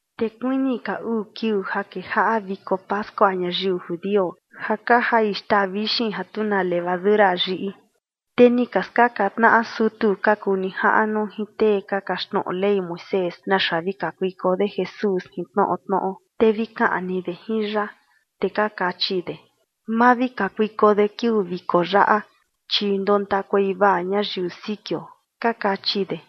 Te kuini ka uu kiuu ja kejaꞌa viko pascua ñayiu judio, ja ka jai xtaa vixin ja tu na levadura yiꞌi. Te ni ka skaꞌan tnaꞌa sutu ka kuu nijaꞌnu jin tee ka kaxtnoꞌo Ley Moisés naxa vi kakuiko de Jesús jin tnoꞌo tnoꞌo, te vi kaꞌni de jin ya. Te ka kachi de: ―Ma vi kakuiko de kiuu viko yaꞌa, chi ndontakuei vaa ñayiu sikio ―ka kachi de.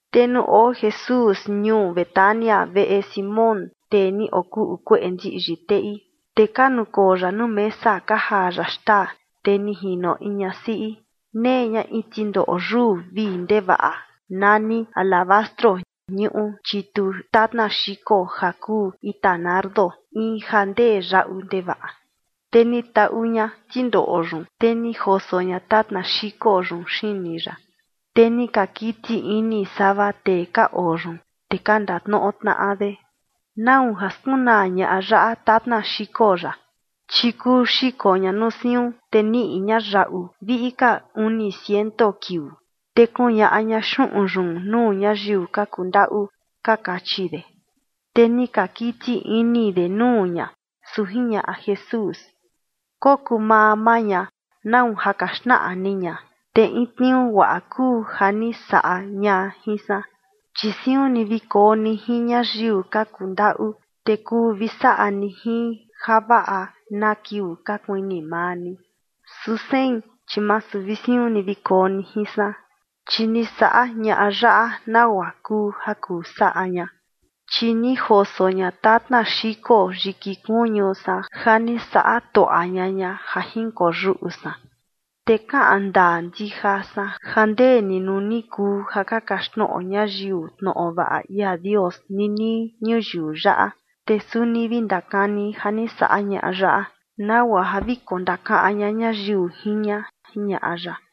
Te nuu oo Jesús ñuu Betania, veꞌe Simón, tee ni okuꞌu kueꞌe ndiꞌyi teꞌi, te ka nukoo ya nuu mesa ka jaa ya xtaa, te ni jino in ñasiꞌi, nee ña in tindoꞌo yuu vii ndevaꞌa nani alabastro ñuꞌu chitu tatna xiko ja kuu ita nardo, in ja ndee yaꞌu ndevaꞌa. Te ni taꞌu ña tindoꞌo yun, te ni joso ña tatna xiko yun xini ya. Te ni ka kiti ini sava tee ka oo yun, te ka ndatnoꞌo tnaꞌa de: ―¿Nau ja skunaa ñaꞌa yaꞌa tatna xiko yaꞌa? Chi kuu xiko ña nuu siun, te niꞌi ña yaꞌu viꞌi ka uni ciento kiuu, te kuñaꞌa ña xuꞌun yun nuu ñayiu ka kuu ndaꞌu ―ka kachi de. Te ni ka kiti ini de nuu ña. Su jiñaꞌa Jesús: ―Kokuu maa maa ña, ¿nau ja ka xnaꞌa ni ña? Te in tniuu guaꞌa kuu ja ni saꞌa ña jin san. Chi siun ni vi koo ni jin ñayiu ka kuu ndaꞌu, te kuu vi saꞌa ni jin javaꞌa na kiuu ka kuini maa ni. Su sein, chi masu vi siun ni vi koo ni jin san. Chi ni saꞌa ñaꞌa yaꞌa nagua kuu ja kuu saꞌa ña, chi ni joso ña tatna xiko yiki kuñu san ja ni saꞌa tuaꞌa ña ña ja jinkoyuꞌu san. Te kaꞌan ndaa ndija san ja ndee ni nuu ni kuu ja ka kaxtnoꞌo ñayiu tnoꞌo vaꞌa ia Dios ninii ñuyiu yaꞌa, te suni vi ndakani ja ni saꞌa ñaꞌa yaꞌa nagua ja vi kondakaꞌan ña ñayiu jin ña ―jiñaꞌa ya.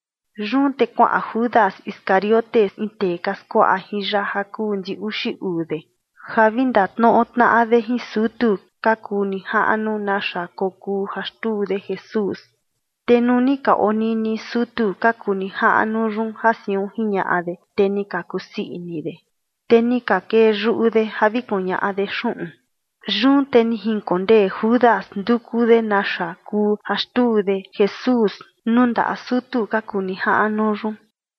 Yun te kuaꞌan Judas Iscariote, in tee ka skuaꞌa jin ya ja kuu ndi uxi uu de, ja vi ndatnoꞌo tnaꞌa de jin sutu ka kuu nijaꞌnu naxa kokuu ja xtuu de Jesús. Te nuu ni ka onini sutu ka kuu nijaꞌnu yun ja siun jiñaꞌa de, te ni ka kusii ini de, te ni ka kee yuꞌu de ja vi kuñaꞌa de xuꞌun. Yun te ni jinkondee Judas nduku de naxa kuu ja xtuu de Jesús nuu ndaꞌa sutu ka kuu nijaꞌnu yun.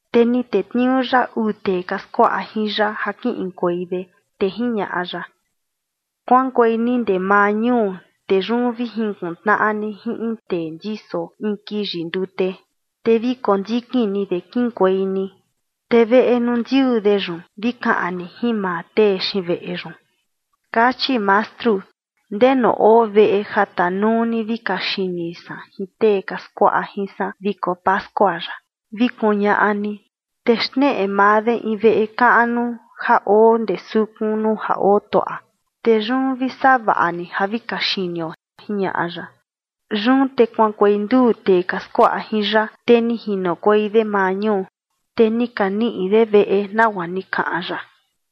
Te ni tetniuu ya uu tee ka skuaꞌa jin ya ja kiꞌinkuei de, te jiñaꞌa ya: ―Kuaꞌankuei ni ndee maa ñuu, te yun vi jinkuꞌun tnaꞌa ni jin in tee ndiso in kiyi ndute, te vi kondikin ni de kiꞌinkuei ni. Te veꞌe nuu ndiuu de yun, vi kaꞌan ni jin maa tee xiin veꞌe yun: “Kachi Mastru: ¿Ndenu oo veꞌe ja tanuu ni vi kaxini san jin tee ka skuaꞌa jin san viko pascua yaꞌa?”, vi kuñaꞌa ni. Te xneꞌe maa de in veꞌe kaꞌnu ja oo ndee sukun nuu ja otuaꞌa. Te yun vi savaꞌa ni ja vi kaxinio ―jiñaꞌa ya. Yun te kuaꞌankuei nduu tee ka skuaꞌa jin ya, te ni jinokuei de maa ñuu, te ni ka niꞌi de veꞌe nagua ni kaꞌan ya.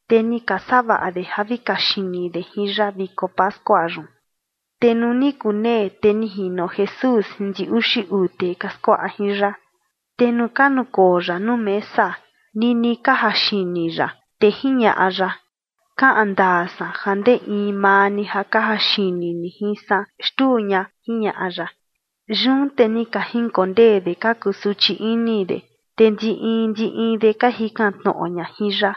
Te ni ka savaꞌa de ja vi kaxini de jin ya viko pascua yun. Te nuu ni kunee, te ni jino Jesús jin ndi uxi uu tee ka skuaꞌa jin ya. Te nuu ka nukoo ya nuu mesa, nini ka jaxini ya, te jiñaꞌa ya: ―Kaꞌan ndaa san ja ndee in maa ni ja ka jaxini ni jin san xtuu ña ―jiñaꞌa ya. Yun te ni ka jinkondee de ka kusuchi ini de, te ndi in ndi in de ka jikan tnoꞌo ña jin ya: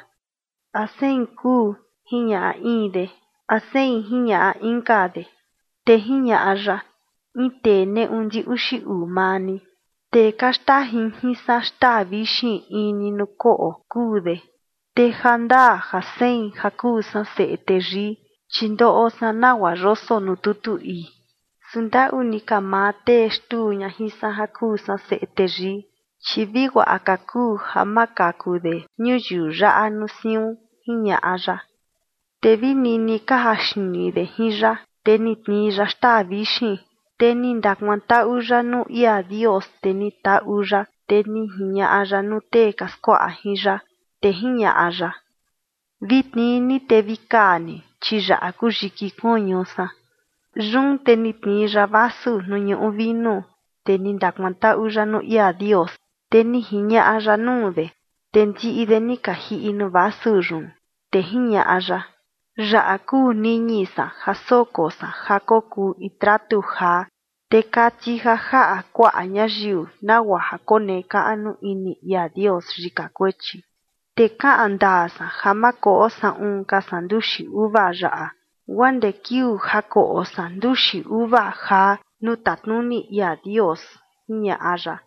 ―¿A sein kuu? ―jiñaꞌa in de. ―¿A sein? ―jiñaꞌa inka de. Te jiñaꞌa ya: ―In tee neꞌu ndi uxi uu maa ni, tee ka xtajin jin san xtaa vixin in ni nuu koꞌo, kuu de. Te jandaa ja sein ja kuu san Seꞌe Teyii, chi ndoꞌo san nagua yoso nuu tutu ii, su ndaꞌu ni ka maa tee xtuu ña jin san ja kuu san Seꞌe Teyii, chi vi guaꞌa ka kuu ja ma kaku de ñuyiu yaꞌa nuu siun ―jiñaꞌa ya. Te vi nini ka jaxini de jin ya, te ni tnii ya xtaa vixin, te ni ndakuantaꞌu ya nuu ia Dios, te ni taꞌu ya, te ni jiñaꞌa ya nuu tee ka skuaꞌa jin ya, te jiñaꞌa ya: ―Vi tnii ni te vi kaa ni, chi yaꞌa kuu yiki kuñu san. Yun te ni tnii ya vasu nuu ñuꞌu vinu, te ni ndakuantaꞌu ya nuu ia Dios, te ni jiñaꞌa ya nuu de, te ndiꞌi de ni ka jiꞌi nuu vasu yun. Te jiñaꞌa ya: ―Yaꞌa kuu niñi san ja soko san ja kokuu in tratu jaa, te kati ja jaꞌa kuaꞌa ñayiu nagua ja konekaꞌnu ini ia Dios yika kuechi. Te kaꞌan ndaa san ja ma koꞌo saꞌun ka san nduxi uva yaꞌa, guaa ndee kiuu ja koꞌo san nduxi uva jaa nuu tatnuni ia Dios ―jiñaꞌa ya.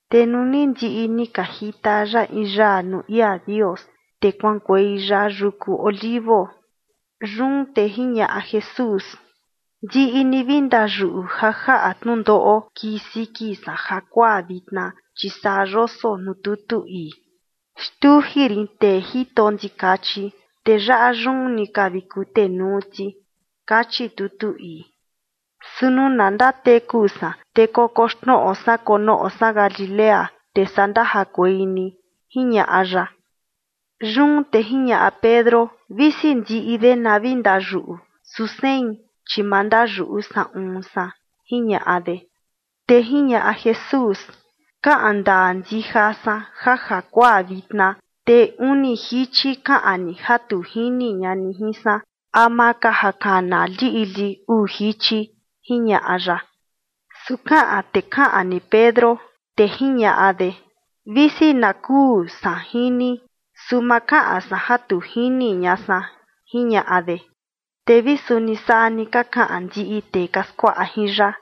Te nuu ni ndiꞌi ni ka jita ya in yaa nuu ia Dios, te kuaꞌankuei ya yuku Olivo. Yun te jiñaꞌa Jesús: ―Ndiꞌi ni vi ndayuꞌu ja jaꞌa tnundoꞌo kii siki san jakuaa vitna, chi saa yoso nuu tutu ii: “Xtuji rin tee jito ndikachi, te yaꞌa yun ni ka vi kutenuu ti”, kachi tutu ii. Su nuu na ndateku san, te kokoxnoꞌo san konoꞌo san Galilea, te saa ndajakuei ni ―jiñaꞌa ya. Yun te jiñaꞌa Pedro: ―Visi ndiꞌi de na vi ndayuꞌu, su sein, chi ma ndayuꞌu saꞌun san ―jiñaꞌa de. Te jiñaꞌa Jesús: ―Kaꞌan ndaa ndija san ja jakuaa vitna, te uni jichi kaꞌan ni ja tu jini ña ni jin san, ama ka ja kana liꞌli uu jichi ―jiñaꞌa ya. Su kaꞌan te kaꞌan ni Pedro, te jiñaꞌa de: ―Visi na kuu san jin ni, su ma kaꞌan san ja tu jini ña san, ―jiñaꞌa de. Te vi suni saa ni ka kaꞌan ndiꞌi tee ka skuaꞌa jin ya.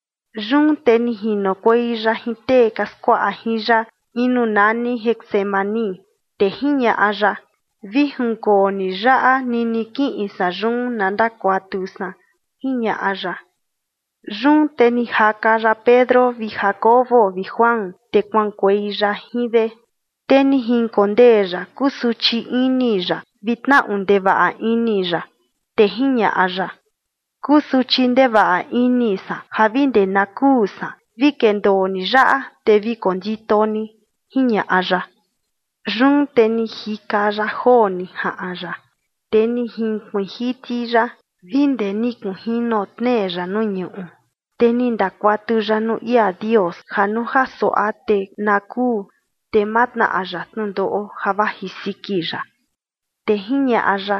Yun te ni jinokuei ya jin tee ka skuaꞌa jin ya in nuu nani Getsemaní, te jiñaꞌa ya: ―Vi jinkoo ni yaꞌa nini kiꞌin san yun na ndakuatu san ―jiñaꞌa ya. Yun te ni jaka ya Pedro vi Jacobo vi Juan, te kuaꞌankuei ya jin de. Te ni jinkondee ya kusuchi ini ya vi tnaꞌu ndevaꞌa ini ya. Te jiñaꞌa ya: ―Kusuchi ndevaꞌa ini san ja vi ndee na kuu san. Vi kendoo ni yaꞌa, te vi kondito ni ―jiñaꞌa ya. Yun te ni jika ya joo ni jaꞌan ya, te ni jinkuiin jiti ya vi ndee ni kunjino tnee ya nuu ñuꞌu, te ni ndakuatu ya nuu ia Dios ja nuu ja suaꞌa te na kuu, te ma tnaꞌa ya tnundoꞌo ja vaji siki ya. Te jiñaꞌa ya: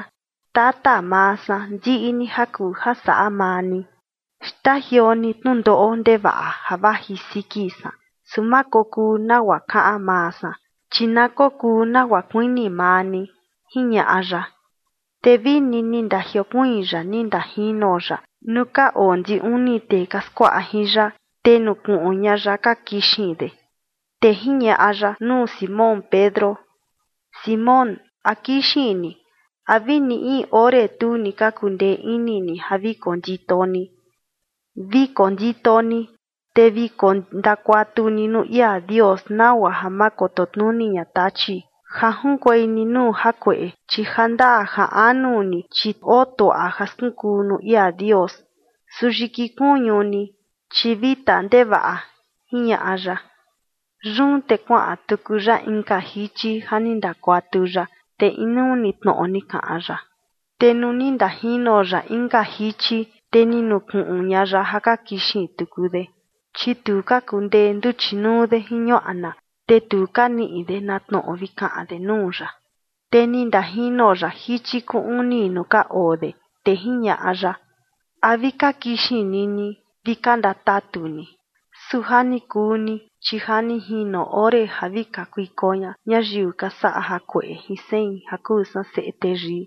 ―Tata maa san, ndiꞌi ni ja kuu ja saꞌa maa ni, xtajioo ni tnundoꞌo ndevaꞌa ja vaji siki san. Su ma kokuu nagua kaꞌan maa san, chi na kokuu nagua kuini maa ni ―jiñaꞌa ya. Te vini ni ndajiokuiin ya ni ndajino ya nuu ka oo ndi uni tee ka skuaꞌa jin ya, te ni nukuꞌun ña ya ja ka kixin de. Te jiñaꞌa ya nuu Simón Pedro: ―Simón, ¿a kixin ni? ¿A vini in ore tu ni ka kundee ini ni ja vi kondito ni? Vi kondito ni, te vi kondakuatu ni nuu ia Dios, nagua ja ma koto tnuni ña Tachi ja junkuei ni nuu jakueꞌe, chi jandaa ja anu ni, chi oo tuaꞌa ja skunkuu nuu ia Dios, su yiki kuñu ni, chi vita ndevaꞌa ―jiñaꞌa ya. Yun te kuaꞌan tuku ya inka jichi ja ni ndakuatu ya, te inuu ni tnoꞌo ni kaꞌan ya. Te nuu ni ndajino ya inka jichi, te ni nukuꞌun ña ya ja ka kixin tuku de, chi tu ka kundee nduchi nuu de jin ñuaꞌna, te tu ka niꞌi de na tnoꞌo vi kaꞌan de nuu ya. Te ni ndajino ya jichi kuu uni nuu ka oo de, te jiñaꞌa ya: ―¿A vi ka kixin ni ni vi ka ndatatu ni? Su ja ni kuu ni, chi ja ni jino ore ja vi kakuiko ña ñayiu ka saꞌa jakueꞌe jin sein ja kuu san Seꞌe Teyii.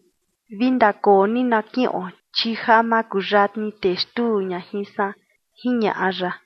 Vi ndakoo ni na kiꞌon, chi ja makuyatni tee xtuu ña jin san ―jiñaꞌa ya.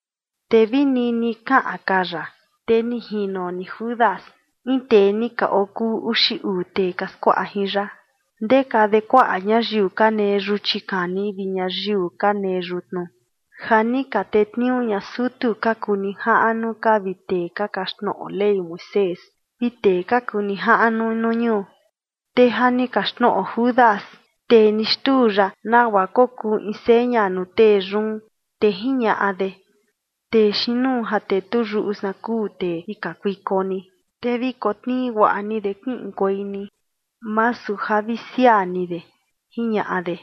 Te vi nini kaꞌan ka ya, te ni jino ni Judas, in tee ni ka okuu uxi uu tee ka skuaꞌa jin ya, ndeka de kuaꞌa ñayiu ka nee yuchi kani vi ñayiu ka nee yutnu, ja ni ka tetniuu ña sutu ka kuu nijaꞌnu ka vi tee ka kaxtnoꞌo Ley Moisés vi tee ka kuu nijaꞌnu nuu ñuu. Te ja ni kaxtnoꞌo Judas, tee ni xtuu ya, nagua kokuu in seña nuu tee yun, te jiñaꞌa de: ―Tee xiin nuu ja tetuyuꞌu san kuu tee vi kakuiko ni. Te vi kotnii guaꞌa ni de kiꞌinkuei ni, masu ja vi siaa ni de ―jiñaꞌa de.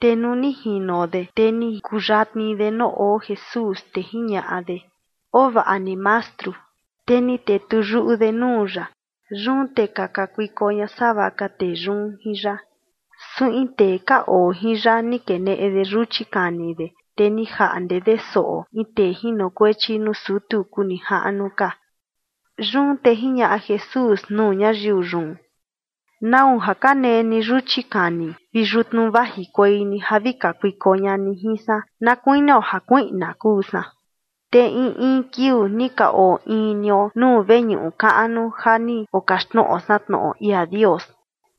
Te nuu ni jino de, te ni kuyatni de nuu oo Jesús, te jiñaꞌa de: ―Oo vaꞌa ni, Mastru. Te ni tetuyuꞌu de nuu ya. Yun te ka kakuiko ña sava ka tee yun jin ya. Su in tee ka oo jin ya ni keneꞌe de yuchi kani de, te ni jaꞌnde de soꞌo in tee jinokuechi nuu sutu kuu nijaꞌnu ka. Yun te jiñaꞌa Jesús nuu ñayiu yun: ―¿Nau ja ka nee ni yuchi kani vi yutnu vajikuei ni ja vi kakuiko ña ni jin san na kuinio ja kuiꞌna kuu san? Te in in kiuu ni ka oo in nio nuu veñuꞌu kaꞌnu ja ni okaxtnoꞌo san tnoꞌo ia Dios,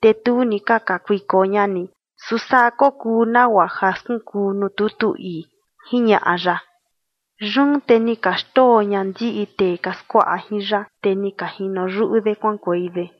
te tu ni ka kakuiko ña ni. Su saa kokuu nagua ja skunkuu nuu tutu ii ―jiñaꞌa ya. Yun te ni ka xndoo ña ndiꞌi tee ka skuaꞌa jin ya, te ni ka jino yuꞌu de kuaꞌankuei de.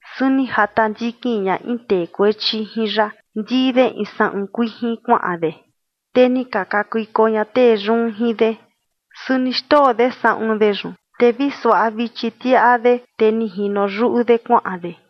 Su ni jata ndikin ña in tee kuechi jin ya, ndii de in saꞌun kuijin kuaꞌan de, te ni ka kakuiko ña tee yun jin de. Su ni xndoo de saꞌun de yun, te vi suaꞌa vichi tiaꞌa de, te ni jino yuꞌu de kuaꞌan de.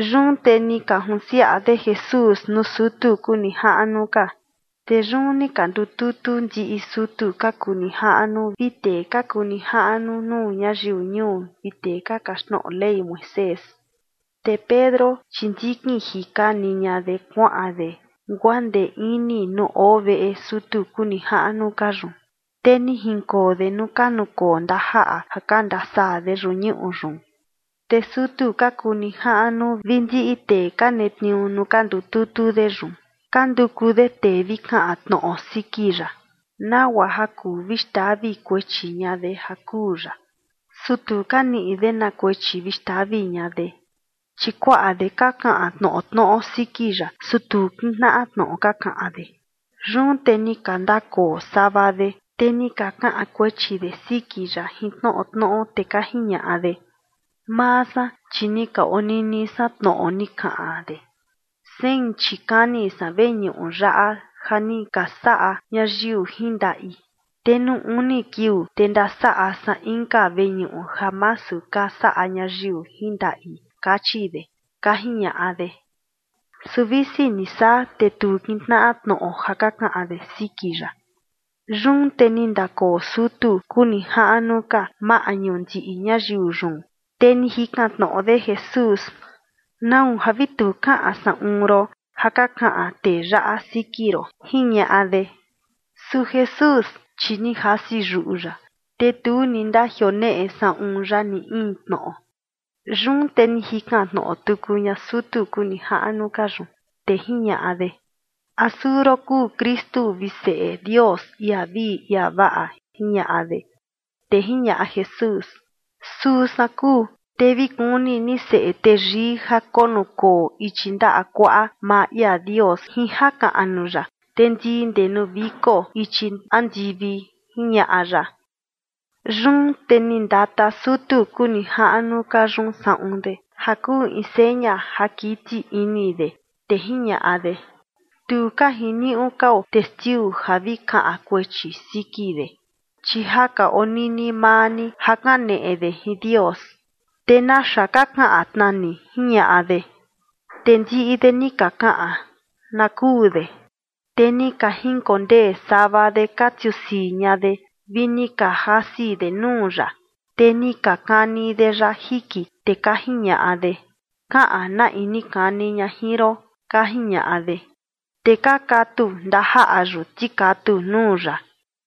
Yun te ni ka junsiaꞌa de Jesús nuu sutu kuu nijaꞌnu ka. Te yun ni ka ndututu ndiꞌi sutu ka kuu nijaꞌnu vi tee ka kuu nijaꞌnu nuu ñayiu ñuu vi tee ka kaxtnoꞌo Ley Moisés. Te Pedro, chi ndikin jika ni ña de kuaꞌan de guaa ndee ini nuu oo veꞌe sutu kuu nijaꞌnu ka yun, te ni jinkoo de nuu ka nukoo ndajaꞌa ja ka ndasaa de yuꞌu ñuꞌu yun. Te sutu ka kuu nijaꞌnu vi ndiꞌi tee ka netniuu nuu ka ndututu de yun, ka nduku de tee vi kaꞌan tnoꞌo siki ya, nagua ja kuu vi xtavi kuechi ña de ja kuu ya. Su tu ka niꞌi de na kuechi vi xtavi ña de. Chi kuaꞌa de ka kaꞌan tnoꞌo tnoꞌo siki ya, su tu kintnaꞌa tnoꞌo ka kaꞌan de. Yun te ni ka ndakoo sava de, te ni ka kaꞌan kuechi de siki ya jin tnoꞌo tnoꞌo, te ka jiñaꞌa de: ―Maa san, chi ni ka onini san tnoꞌo ni kaꞌan de: “Sein chi kani san veñuꞌu yaꞌa ja ni ka saꞌa ñayiu jin ndaꞌi, te nuu uni kiuu, te ndasaꞌa san inka veñuꞌu ja masu ka saꞌa ñayiu jin ndaꞌi”, kachi de ―ka jiñaꞌa de. Su visi ni saa, te tu kintnaꞌa tnoꞌo ja ka kaꞌan de siki ya. Yun te ni ndakoo sutu kuu nijaꞌnu ka maꞌñu ndiꞌi ñayiu yun, te ni jikan tnoꞌo de Jesús: ―¿Nau ja vi tu kaꞌan saꞌun ron ja ka kaꞌan tee yaꞌa siki ron? ―jiñaꞌa de. Su Jesús, chi ni jasi yuꞌu ya, te tu ni ndajioneꞌe saꞌun ya ni in tnoꞌo. Yun te ni jikan tnoꞌo tuku ña sutu kuu nijaꞌnu ka yun, te jiñaꞌa de: ―¿A suu ron kuu Kristu vi Seꞌe Dios, ia vii ia vaꞌa? ―jiñaꞌa de. Te jiñaꞌa Jesús: ―Suu san kuu. Te vi kuni ni Seꞌe Teyii ja konukoo ichi ndaꞌa kuaꞌa maa ia Dios jin jakaꞌnu ya, te ndii ndee nuu viko ichi andivi ―jiñaꞌa ya. Yun te ni ndata sutu kuu nijaꞌnu ka yun saꞌun de ja kuu in seña ja kiti ini de, te jiñaꞌa de: ―Tu ka jiniuꞌu kao testiu ja vi kaꞌan kuechi siki de. Chi ja ka onini maa ni ja kaneꞌe de jin Dios. ¿Te naxa ka kaꞌan tna ni? ―jiñaꞌa de. Te ndiꞌi de ni ka kaꞌan: ―Na kuu de. Te ni ka jinkondee sava de ka tiusii ña de, vi ni ka jasi de nuu ya, te ni ka kani de ya jiki, te ka jiñaꞌa de: ―Kaꞌan na in ni kani ña jin ron, ―ka jiñaꞌa de. Te ka katu ndajaꞌa yun tikatu nuu ya.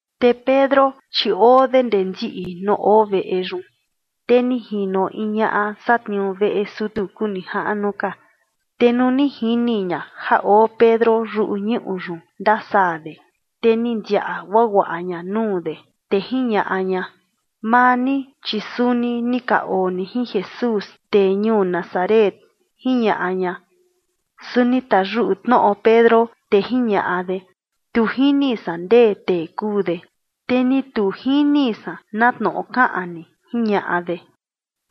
Te Pedro, chi oo de ndee ndiꞌi nuu oo veꞌe yun. Te ni jino in ñaꞌa satniuu veꞌe sutu kuu nijaꞌnu ka. Te nuu ni jini ña ja oo Pedro yuꞌu ñuꞌu yun ndasaa de, te ni ndiaꞌa guaguaꞌa ña nuu de, te jiñaꞌa ña: ―Maa ni, chi suni ni ka oo ni jin Jesús, tee ñuu Nazaret ―jiñaꞌa ña. Su ni tayuꞌu tnoꞌo Pedro, te jiñaꞌa de: ―Tu jini san ndee tee kuu de, te ni tu jini san na tnoꞌo kaꞌan ni ―jiñaꞌa de.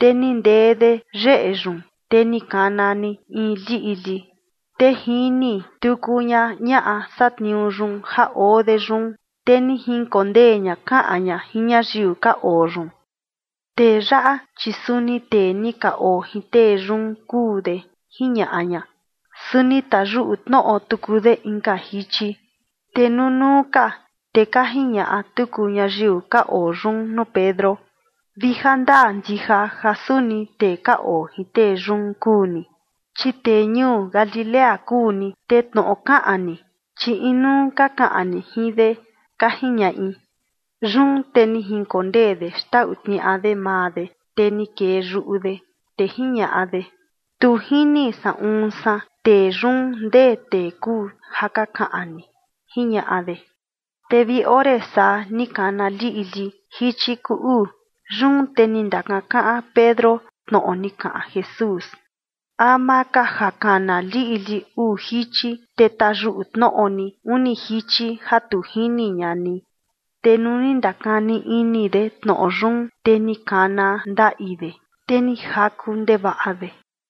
Te ni ndee de yeꞌe yun, te ni kana ni in liꞌli. Te jini tuku ña ñaꞌa satniuu yun ja oo de yun, te ni jinkondee ña kaꞌan ña jin ñayiu ka oo yun: ―Tee yaꞌa, chi suni tee ni ka oo jin tee yun kuu de ―jiñaꞌa ña. Su ni tayuꞌu tnoꞌo tuku de inka jichi. Te nunuu ka, te ka jiñaꞌa tuku ñayiu ka oo yun nuu Pedro: ―Vi jandaa ndija ja suni tee ka oo jin tee yun kuu ni, chi tee ñuu Galilea kuu ni, te tnoꞌo kaꞌan ni, chi inuu ka kaꞌan ni jin de ―ka jiñaꞌi. Yun te ni jinkondee de xtau tniaꞌa de maa de, te ni kee yuꞌu de, te jiñaꞌa de: ―Tu jini saꞌun san tee yun ndee tee kuu ja ka kaꞌan ni ―jiñaꞌa de. Te vi ore saa ni kana liꞌli jichi kuu uu. Yun te ni ndakankaꞌan Pedro tnoꞌo ni kaꞌan Jesús: “Ama ka ja kana liꞌli uu jichi, te tayuꞌu tnoꞌo ni uni jichi ja tu jini ña ni”. Te nuu ni ndakani ini de tnoꞌo yun, te ni kana ndaꞌi de, te ni jaku ndevaꞌa de.